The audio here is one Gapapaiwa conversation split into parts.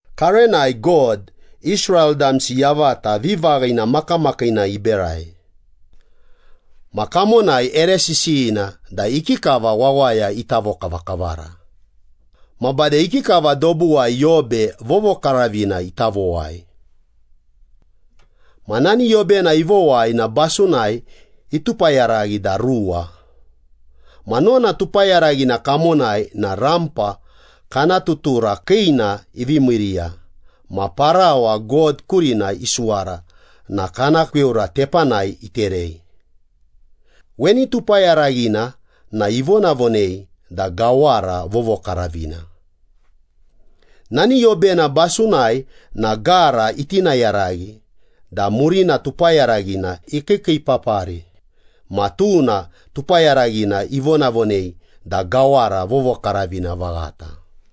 Karenai God, Israel damsi yavata vivaghina makamakiina iberai. Ma kamonai ere sisiyina da ikikava wawaya ita vokavakavara, ma bade ikikava dobuwai yobe vovokaravina ita vowai. Ma nani yobena ivowai na basunai itupayaraghi da ruwa. Ma nona tupayaraghina kamonai na rampa kana tutura kiina ivi miiriya ma parawa God kurina isuwara na kana kweura tepanai iterei. Weni tupayaraghina na ivonavonei da Gawara Vovokaravina. Nani yobena basunai na gara itinayaraghi da murina tupayaraghina ikiikiipapari ma tuna tupayaraghina ivonavonei da Gawara Vovokaravina Vaghata.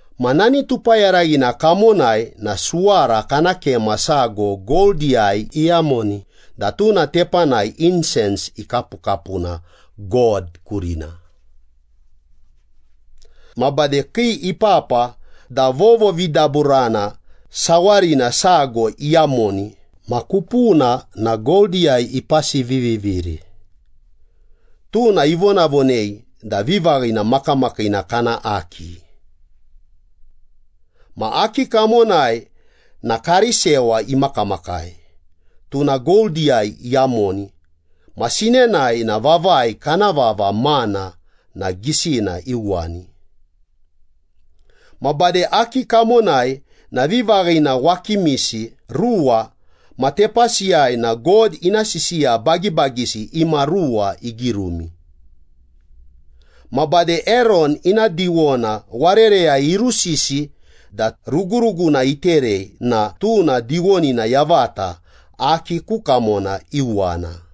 Ma nani tupayaraghina kamonai na suwara kana kema sago goldiyai iyamoni da tuna tepanai insens ikapukapuna God kurina. Ma bade kii ipapa da vovovidaburana sawarina sago iyamoni ma kupuna na goldiyai ipasiviviviri. Tuna ivonavonei da vivaghina makamakiina kana Aki. Ma Aki kamonai na karisewa imakamakai, tuna goldiyai iyamoni ma sinenai na vavai kana vava mana na gisina iuwani. Ma bade Aki kamonai na vivaghina wakimisi ruwa ma tepasiyai na God ina sisiya bagibagisi imaruwa igirumi. Ma bade Eron ina diwona warereyai irusisi da ruguruguna iterei na tuna diwonina yavata Aki ku kamona iuwana.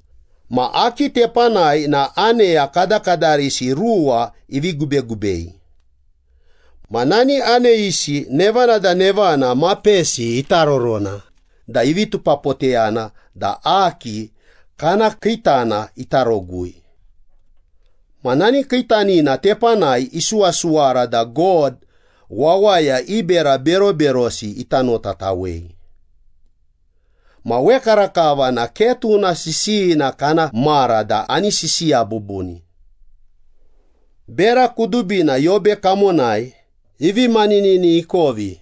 Ma Aki tepanai na aneya kadakadarisi ruwa ivi gubegubei. Ma nani aneyisi nevana da nevana mapesi itarorona da ivi tupapoteyana da Aki kana kiitana ita rogui. Ma nani kiitanina tepanai isuwasuwara da God wawaya i bera beroberosi ita notatawei. Ma wekarakava na ke tuna sisiyina kana mara da ani sisiya bubuni. Bera kudubina yobe kamonai ivi maninini ikovi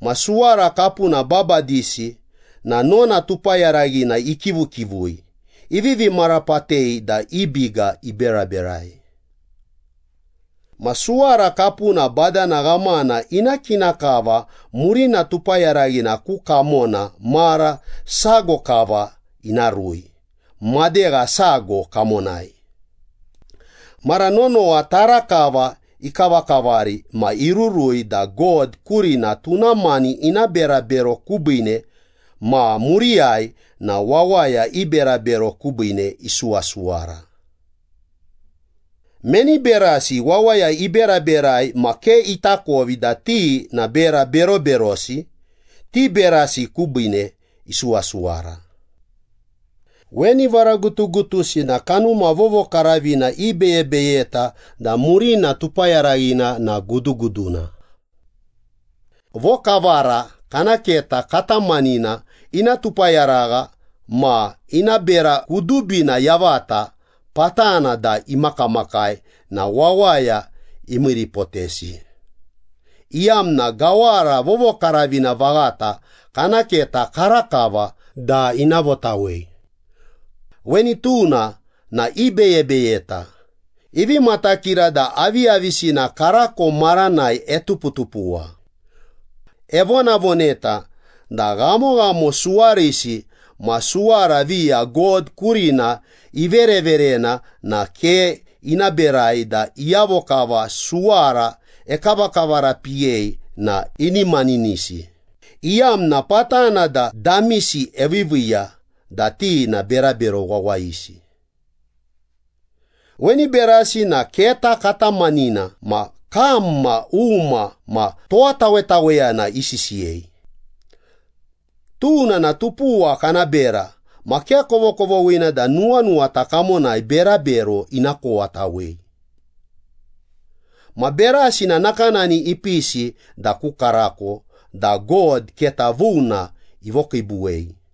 ma suwara kapuna babadisi na nona tupayaraghina ikivukivui, ivivi marapatei da i biga iberaberai. Ma suwara kapuna badana ghamana ina kina kava murina tupayaraghina ku kamona mara sago kava ina rui madegha sago kamonai. Mara nonowa tara kava ikavakavari ma irurui da God kurina tuna mani ina berabero kubiine ma muriyai na wawaya i berabero kubiine isuwasuwara. Meni berasi wawaya iberaberai ma ke itakovi da ti na bera beroberosi, ti berasi kubiine isuwasuwara. Weni varagutugutusi na Kanuma Vovokaravina ibeyebeyeta da murina tupayaraghina na guduguduna. Vokavara kana keta katamanina, ina tupayaragha ma ina bera kudubina yavata patana da imakamakai na wawaya imiiripotesi, iyamna Gawara Vovokaravina Vaghata kana keta karakava da ina votawei. Weni tuna na ibeyebeyeta, ivi matakira da aviyavisina karako maranai etuputupuwa. Evonavoneta da ghamoghamo suwarisi ma suwara viya God kurina ivereverena na ke ina berai da iyavo kava suwara ekavakavarapiyei na ini maninisi, iyamna patana da damisi eviiviiya da ti na berabero wawayisi. Weni berasi na keta katamanina ma kam ma uma ma towatawetaweyana isisiyei. Tuna na tupuwa kana bera ma ke kovokovoghina da nuwanuwata kamonai berabero ina kowatawei. Ma berasi na nakanani ipisi da ku karako da God keta vuna ivokiibuwei.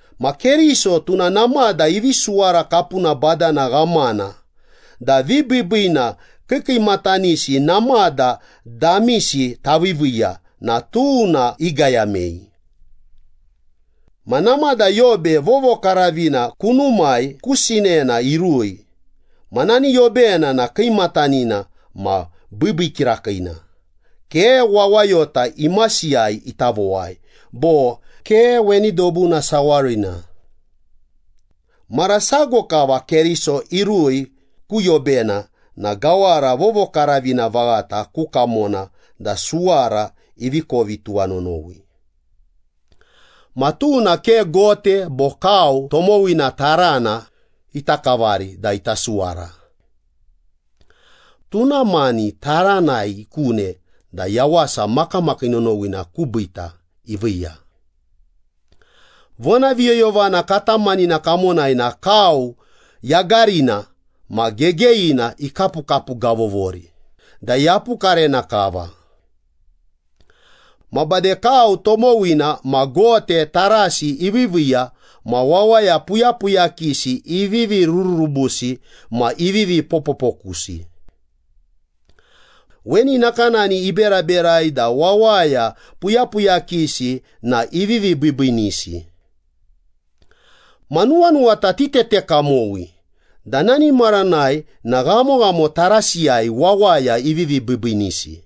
Ma Keriso tuna namada ivi suwara kapuna badana ghamana da vibiibiina kiikiimatanisi namada damisi taviiviiya na tuna igayamei. Ma namada yobe vovokaravina kunumai ku sinena irui ma nani yobena na kiimatanina ma biibii kirakiina, ke wawayota imasiyai ita vowai, bo ke weni dobuna sawarina. Mara sago kava Keriso irui ku yobena na Gawara Vovokaravina Vaghata ku kamona da suwara ivi kovi tuwanonowi. Ma tuna ke gote bo kau tomowina tarana ita kavari da ita suwara. Tuna mani taranai ikune da yawasa makamakii nonowina kubiita iviiya. Vonaviyoyovana katamanina kamonai na kau yagarina ma gegeyina ikapukapugavovori da yapukarena kava. Ma bade kau tomowina ma gote tarasi iviiviiya ma wawaya puyapuyakisi ivivi rururubusi ma ivivi popopokusi. Weni nakanani iberaberai da wawaya puyapuyakisi na ivivi biibiinisi. Ma nuwanuwata titete kamowi da nani maranai na ghamoghamo tarasiyai wawaya ivivi biibiinisi.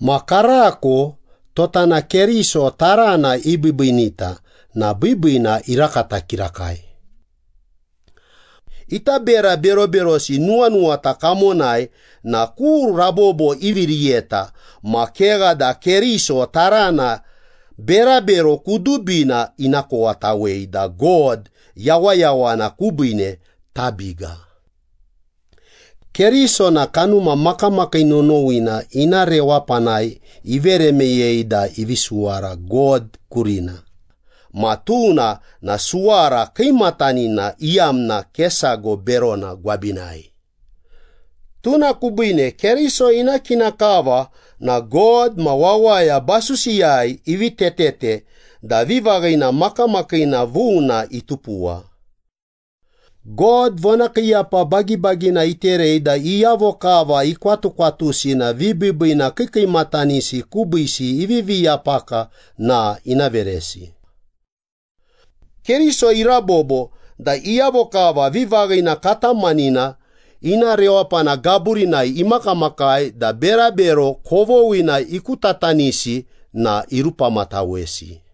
Ma karako, tota na Keriso tarana ibiibiinita na biibiina irakata kirakai. Ita bera beroberosi nuwanuwata kamonai na ku rabobo ivi riyeta ma kegha da Keriso tarana berabero kudubina ina kowatawei da God yawayawana kubiine tabiga. Keriso na Kanuma Makamakii Nonowina ina rewapanai ivere meyei da ivi isuwara God kurina, ma tuna na suwara kiimatanina iyamna ke sago berona gwabinai. Tuna kubiine Keriso ina kina kava na God ma wawaya basusiyai ivi tetete da vivaghina makamakiina vuna itupuwa. God vonakiiyapa bagibagina iterei da iyavo kava ikwatukwatusi na vibiibiina kiikiimatanisi kubiisi ivivi yapaka na ina veresi. Keriso irabobo da iyavo kava vivaghina katamanina ina rewapana gaburinai imakamakai da berabero kovoghina ikutatanisi na irupamatawesi.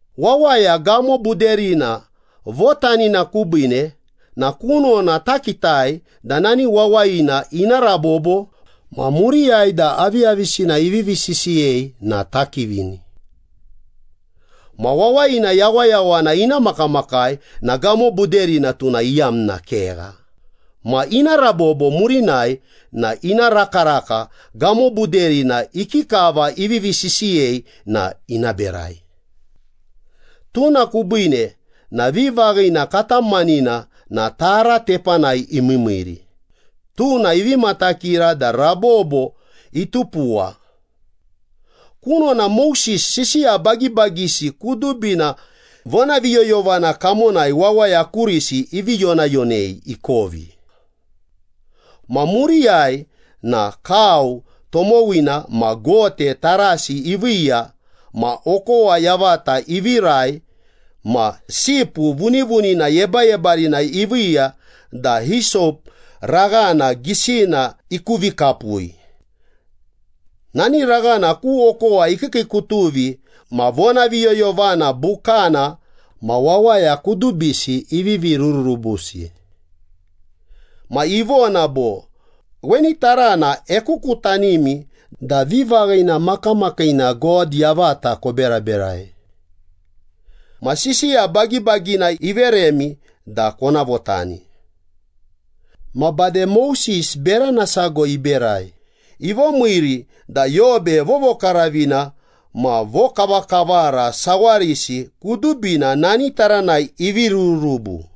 Wawaya gamobuderina votanina kubiine na kunona takitai da nani wawayina ina rabobo ma muriyai da aviyavisina ivivi sisiyei na takivini. Ma wawayina yawayawana ina makamakai na gamobuderina tuna iyamna kegha ma ina rabobo murinai na ina rakaraka gamobuderina ikikava ivivi sisiyei na ina berai. Tuna kubiine na vivaghina katamanina na tara tepanai imiimiiri, tuna ivi matakira da rabobo itupuwa. Kunona Moses sisiya bagibagisi kudubina vonaviyoyovana kamonai wawaya kurisi ivi yonayonei ikovi. Ma muriyai na kau tomowina ma gote tarasi iviiya ma okowa yavata ivirai ma sipu vunivunina yebayebarina iviiya da hisop raghana gisina ikuvikapui. Nani raghana ku okowa ikiikiikutuvi ma vonaviyoyovana bukana ma wawaya kudubisi ivi rururubusi. Ma ivona bo, “Weni tarana ekukutanimi da vivaghina makamakiina God yavata koberaberai. Ma sisiya bagibagina iveremi da kona votani.” Ma bade Moses berana sago iberai, ivomiiri da yobe vovokaravina ma vokavakavara sawarisi kudubina nani taranai ivi rururubu.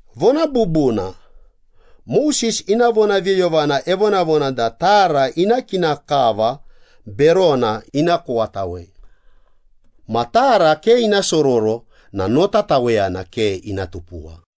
Vona bubuna, Moses ina vonaviyoyovana evonavona da tara ina kina kava berona ina kowatawei. Ma tara ke ina sororo na notataweyana ke ina tupuwa.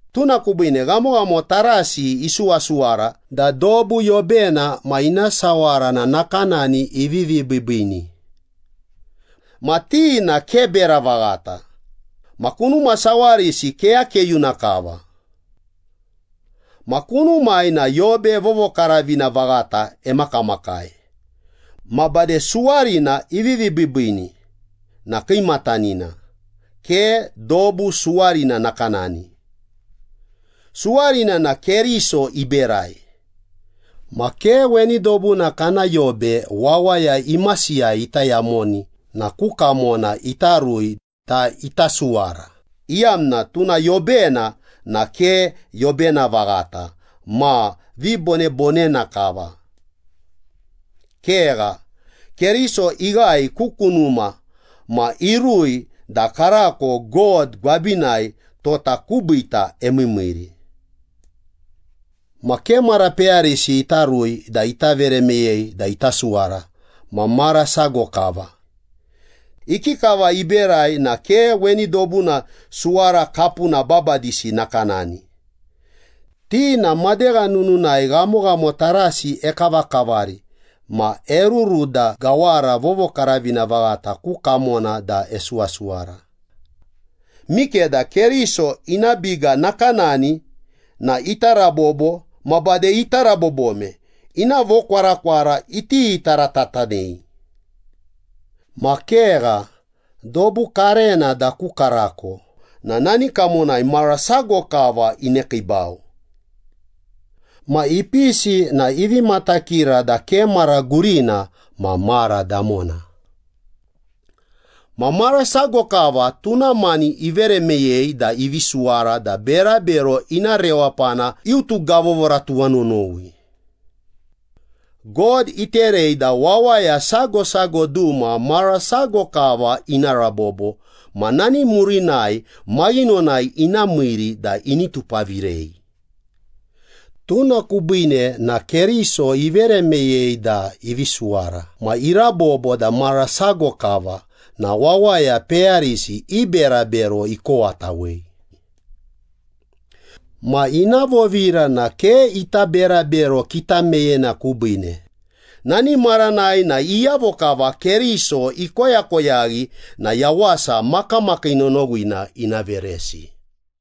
Tuna kubiine ghamoghamo tarasi isuwasuwara da dobu yobena ma ina sawara na nakanani ivivi biibiini. Ma ti na ke bera vaghata, ma kunuma sawarisi keyakeyuna kava. Ma kunumai na yobe vovokaravina vaghata emakamakai. Ma bade suwarina ivi biibiini na kiimatanina, ke dobu suwarina nakanani. Suwarina na Keriso iberai. Ma ke weni dobuna kana yobe wawaya imasiyai ita yamoni na ku kamona ita rui da ita suwara, iyamna tuna yobena na ke yobena vaghata ma vibonebonena kava. Kegha, Keriso ighae ku kunuma ma irui da karako God gwabinai tota kubiita emiimiiri. Ma ke mara peyarisi ita rui da ita vere meyei da ita suwara ma mara sago kava. Ikikava iberai na ke weni dobuna suwara kapuna babadisi nakanani. Ti na madegha nununai ghamoghamo tarasi ekavakavari ma eruru da Gawara Vovokaravina Vaghata ku kamona da esuwasuwara. Mikeda Keriso ina biga nakanani na ita rabobo ma bade ita rabobome, ina vokwarakwara iti taratatanei. Ma kegha, dobu karena da ku karako na nani kamonai mara sago kava inekiibau. Ma ipisi na ivi matakira da ke mara gurina ma mara damona. Ma mara sago kava tuna mani ivere meyei da ivi suwara da berabero ina rewapana iutugavovora tuwanonowi. God iterei da wawaya sago sago duma mara sago kava ina rabobo ma nani murinai maghinonai ina miiri da ini tupavirei. Tuna kubiine na Keriso ivere meyei da ivi suwara ma irabobo da mara sago kava na wawaya peyarisi i berabero ikowatawei. Ma ina vovira na ke ita berabero kitameyena kubiine. Nani maranai na iyavo kava Keriso ikoyakoyaghi na yawasa makamakii nonowina ina veresi.